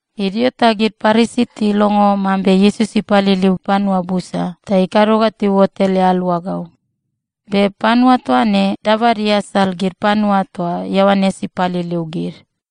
Idio ta gid Parisi tilongo mambe Iesus ipaliliu panua busa ta ikado ga tiuot ele aluagau. Be panua toa ne dabad iasal gid panua toa Ioanes ipaliliu gid.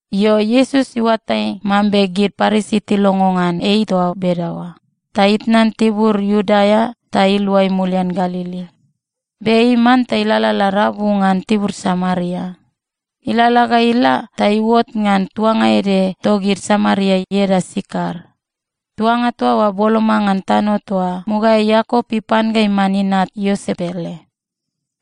Io, Iesus iuatai mambe gid Parisi tilongo ngan ei toa bedaoa, ta itnan tibur Iudea ta iluai mulian Galili. Be ei manta ilalala rabu ngan tibur Samaria. Ilalala ga ila ta iuot ngan tuanga ede togid Samaria ieda Sikar. Tuanga toa oa boloma ngan tano toa mugaeai Iakop ipan ga iman inat Iosep ele.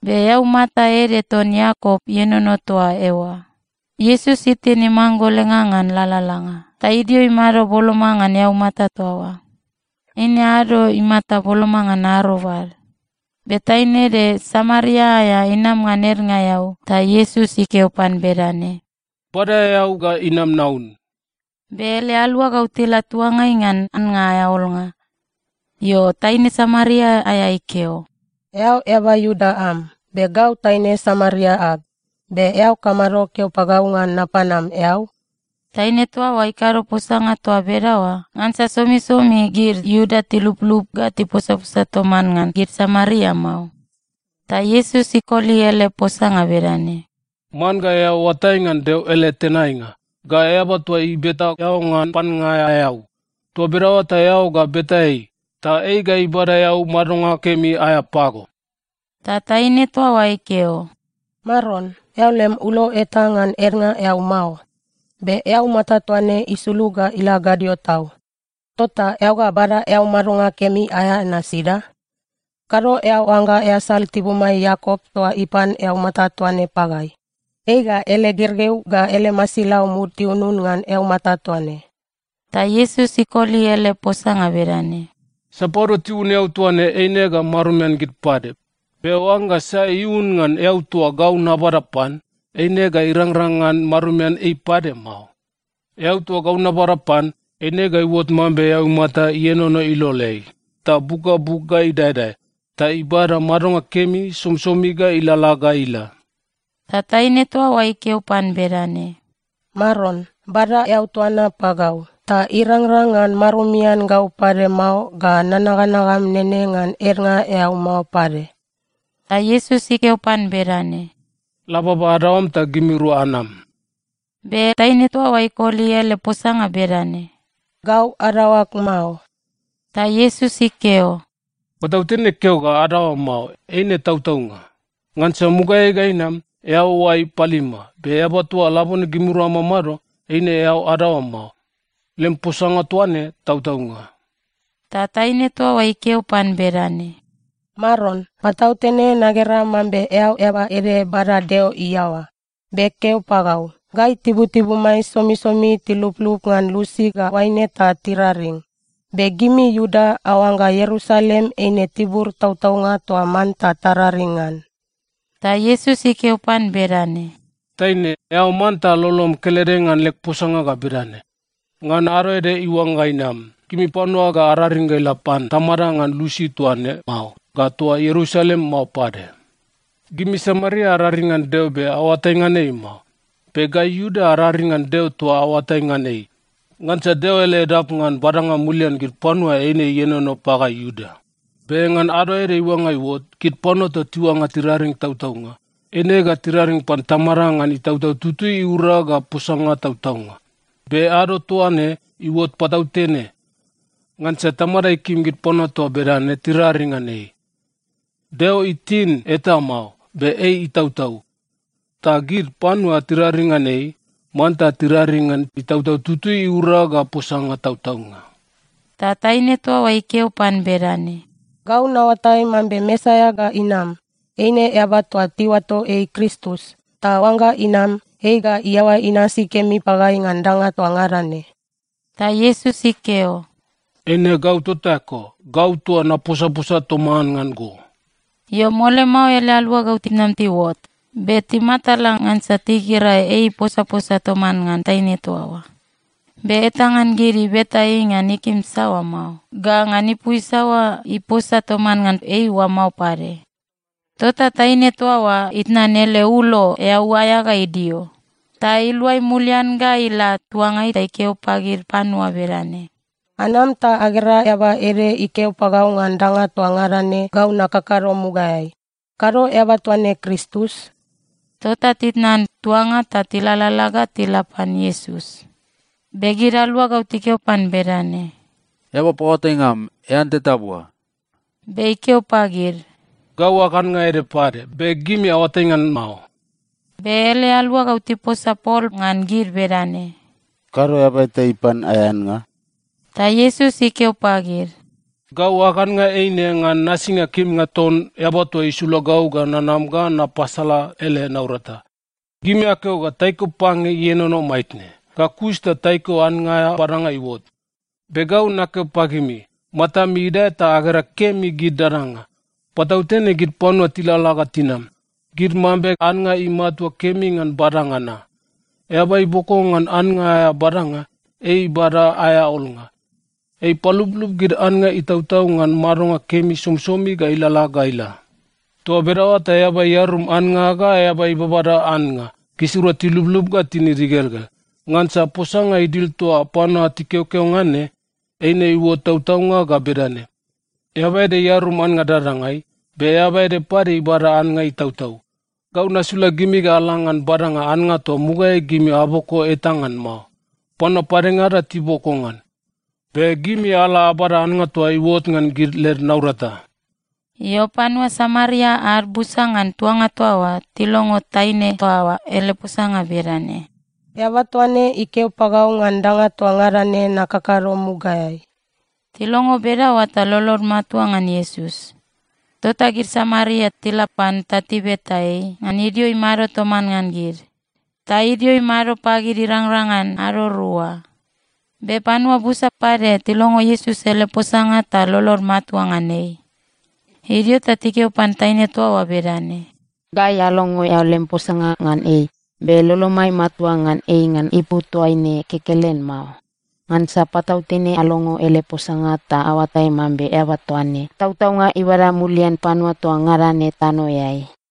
Be eaumata ede ton Iakop ienono toa eoa. Iesus itin imanggolenga ngan lalalanga, ta idio imado boloma ngan eaumata toa oa. Eine ado imata boloma ngan arobad. Be taine ede Samaria aea inam ngan ednga eau, ta Iesus ikeo pan bedane, “Bada eau ga inam naun.” Be ele aluagau tila tuangai ngan annga aea olnga. Io, taine Samaria aea ikeo, “Eao eaba Iuda am, be gau taine Samaria ag. Be eao kamado keo pagau ngan napan am eau?” Taine toa oa ikado posanga toa bedaoa ngansa somisomi gid Iuda tiluplup ga tiposaposa toman ngan gid Samaria mao. Ta Iesus ikoli ele posanga bedane, “Man ga eao oatai ngan Deo ele tenainga, ga eaba toa ibeta eao ngan pannga aea eau. Toa bedaoa ta eao ga beta ei, ta ei ga ibada eau madonga kemi aea pago.” Ta taine toa oa ikeo, “Maron, eao lem ulo eta ngan ednga eau mao. Be eaumata toa ne isulug ga ila gadio tau. Tota eao ga bada eau madonga kemi aea na sida? Kado eao oangga easal tibumai Iakop toa ipan eaumata toa ne pagai. Ei ga ele gergeu ga ele masilau mud tiunun ngan eaumata toa ne.” Ta Iesus ikoli ele posanga bedane, “Sapadua tiun eau toa ne eine ga marumian gid pade. Be oangga sai iun ngan eau toa gau nabada pan, eine ga irangrang ngan marumian ei pade mao. Eau toa gau nabada pan, eine ga iuot mambe eaumata ienono iloleai ta buk ga buk ga idaedae, ta ibada madonga kemi somisomi ga ilalala ga ila.” Ta taine toa oa ikeo pan bedane, “Maron, bada eau toa na pagau, ta irangrang ngan marumian gau pade mao ga nanaganagam nene ngan ednga eau mao pade.” Ta Iesus ikeo pan bedane, “La baba adaoam ta gimirua anam.” Be taine toa oa ikoli ele posanga bedane, “Gau adaoag mao.” Ta Iesus ikeo, “Patautene keo ga adaoam mao, eine tautaunga. Ngansa mugaeai ga inam, eao oai palima, be eaba toa labone gimirua amamado, eine eao adaoam mao. Lem posanga toa ne tautaunga.” Ta taine toa oa ikeo pan bedane, “Maron, patautene nagera mambe eao eaba ede bada Deo iaoa. Be keo pagau, gai tibutibumai somisomi tiluplup ngan lusi ga oaine ta tiraring. Be gimi Iuda aoangga Ierusalem eine tibur tautaunga toa manta tararing ngan.” Ta Iesus ikeo pan bedane, “Taine, eao manta lolom kelede ngan leg posanga ga bedane: Ngan ado ede iuangga inam, gimi panua ga araring ga ila pan Tamada ngan lusi toa ne mao ga toa Ierusalem mao pade. Gimi Samaria araring ngan Deo be aoatai ngan ei mao. Be gai Iuda araring ngan Deo toa aoatai ngan ei, ngansa Deo ele edap ngan badanga mulian gid panua eine ienono pagai Iuda. Be ngan ado ede iuangga iuot, gid panua toa tiuangga tiraring tautaunga, eine ga tiraring pan Tamada ngan Itautau Tutui iura ga posanga tautaunga. Be ado toa ne iuot patautene. Ngansa Tamada ikim gid panua toa bedane tiraring ngan ei. Deo itin eta mao, be ei itautau. Ta gid panua tiraring ngan ei, manta tiraring ngan Itautau Tutui iura ga posanga tautaunga.” Ta taine toa oa ikeo pan bedane, “Gau naoatai mambe Mesaia ga inam. Eine eaba toa tiuato ei Kristus. Ta oangga inam, ei ga iaoa inasi kemi pagai ngan danga toa ngada ne.” Ta Iesus ikeo, “Eine gau tota eko, gau toa naposaposa toman ngan go.” Io, mole mao ele aluagau tinam tiuot, be timatala ngansa tigera ei iposaposa toman ngan taine toa oa. Be eta ngan gid ibeta ei ngan ikim saoa mao, ga ngan ipu isaoa iposa toman ngan ei oa mao pade. Tota taine toa oa itnan ele ulo eau aea ga idio, ta iluai mulian ga ila tuangai ta ikeo pagid panua bedane, “Anam ta agera eaba ede ikeo pagau ngan danga toa ngada ne gau nakakado mugaeai. Kado eaba toa ne Kristus?” Tota titnan tuanga ta tilalala ga tila pan Iesus. Be gid aluagau tikeo pan bedane, “Eaba paoatainga am, ean teta bua.” Be ikeo pagid, “Gau ag annga ede pade, be gimi aoatai ngan mao.” Be ele aluagau tiposa pol ngan gid bedane, “Kado eaba eta ipan aea annga?” Ta Iesus ikeo pagid, “Gau ag annga eine ngan nasinga kimnga ton Eaba toa isula gau ga nanam ga napasala ele naurata. Gimi akeo ga taiko pange ienono maitne, ga kus ta taiko annga aea badanga iuot. Be gau nakeo pagimi, matami idae ta agera kemi gid dadanga. Patautene gid panua tilalala ga tinam, gid mambe annga imatua kemi ngan badanga na. Eaba iboko ngan annga aea badanga, ei ibada aea olnga. Ei ipaluplup gid annga itautau ngan madonga kemi somisomi ga ilalala ga ila. Toa bedaoa ta eaba iarum annga ga eaba ibabada annga, gisirua tiluplup ga tinid igelgel. Ngansa posanga idil toa panua tikeokeo ngan ne, eine iuot tautaunga ga bedane, ‘Eaba ede iarum annga dadangai, be eaba ede pade ibada annga itautau.’ Gau nasula gimi ga ala ngan badanga annga toa mugaeai gimi aboko eta ngan mao. Panua padengada tiboko ngan. Be gimi ala abada annga toa iuot ngan gid led naurata.” Io, panua Samaria ad busa ngan tuanga toa oa tilongo taine toa oa ele posanga bedane, “Eaba toa ne ikeo pagau ngan danga toa ngada ne nakakado mugaeai.” Tilongo bedaoa ta lolod matua ngan Iesus. Tota gid Samaria tila pan ta tibeta ei ngan idio imado toman ngan gid, ta idio imado pagid irangrang ngan ado rua. Be panua busa pade tilongo Iesus ele posanga ta lolod matua ngan ei. Idio ta tikeo pan taine toa oa bedane, “Gai alongo eao lem posanga ngan ei, be lolomai matua ngan ei ngan ipu toaine kekelen mao. Ngansa patautene alongo ele posanga ta aoatai mambe eaba toa ne, tautaunga ibada mulian panua toa ngada ne tanoeai.”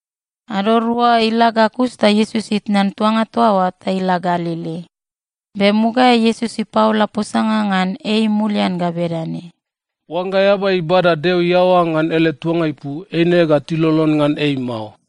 Ado rua ila ga kus ta Iesus itnan tuanga toa oa ta ila Galili. Be mugaeai Iesus ipaola posanga ngan ei mulian ga bedane, “Oangga eaba ibada Deo iaoa ngan ele tuanga ipu, eine ga tilolon ngan ei mao.”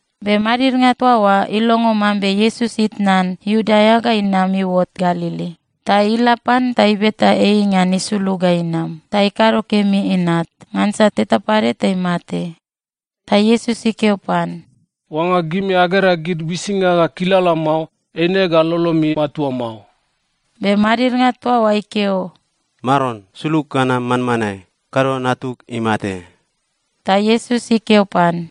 Be madidnga toa oa ilongo mambe Iesus itnan Iudea ga inam iuot Galili, ta ila pan ta ibeta ei ngan isulug ga inam ta ikado kemi inat, ngansa teta pade ta imate. Ta Iesus ikeo pan, “Oangga gimi agera gid uisinga ga kilala mao, eine ga lolomi matua mao.” Be madidnga toa oa ikeo, “Maron, sulug ga nam manmanae! Kado natug imate.” Ta Iesus ikeo pan,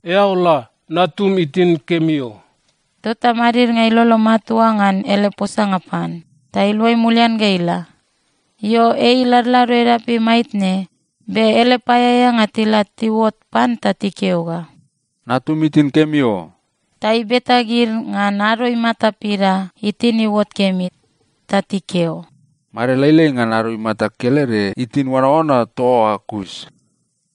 “Eao la. Natum itin kemi o.” Tota madidnga ilolo matua ngan ele posanga pan, ta iluai mulian ga ila. Io, ei iladlado edapeai maitne, be ele paeaeanga tila tiuot pan ta tikeo ga, “Natum itin kemi o!” Ta ibeta gid ngan ado imata pida itin iuot kemi. Ta tikeo, “Made lailai ngan ado imata kelede itin oanaoana toa oa kus.”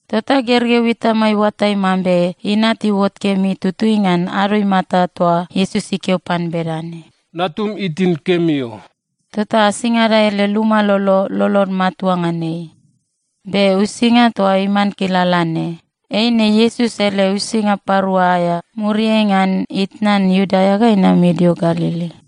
Tota gergeu itama iuatai mambe inat iuot kemi tutui ngan ado imata toa Iesus ikeo pan bedane, “Natum itin kemi o.” Tota asingada ele luma lolo, lolod matua ngan ei. Be uisinga toa iman kilala ne, eine Iesus ele uisinga parua aea muriai ngan itnan Iudea ga inam idio Galili.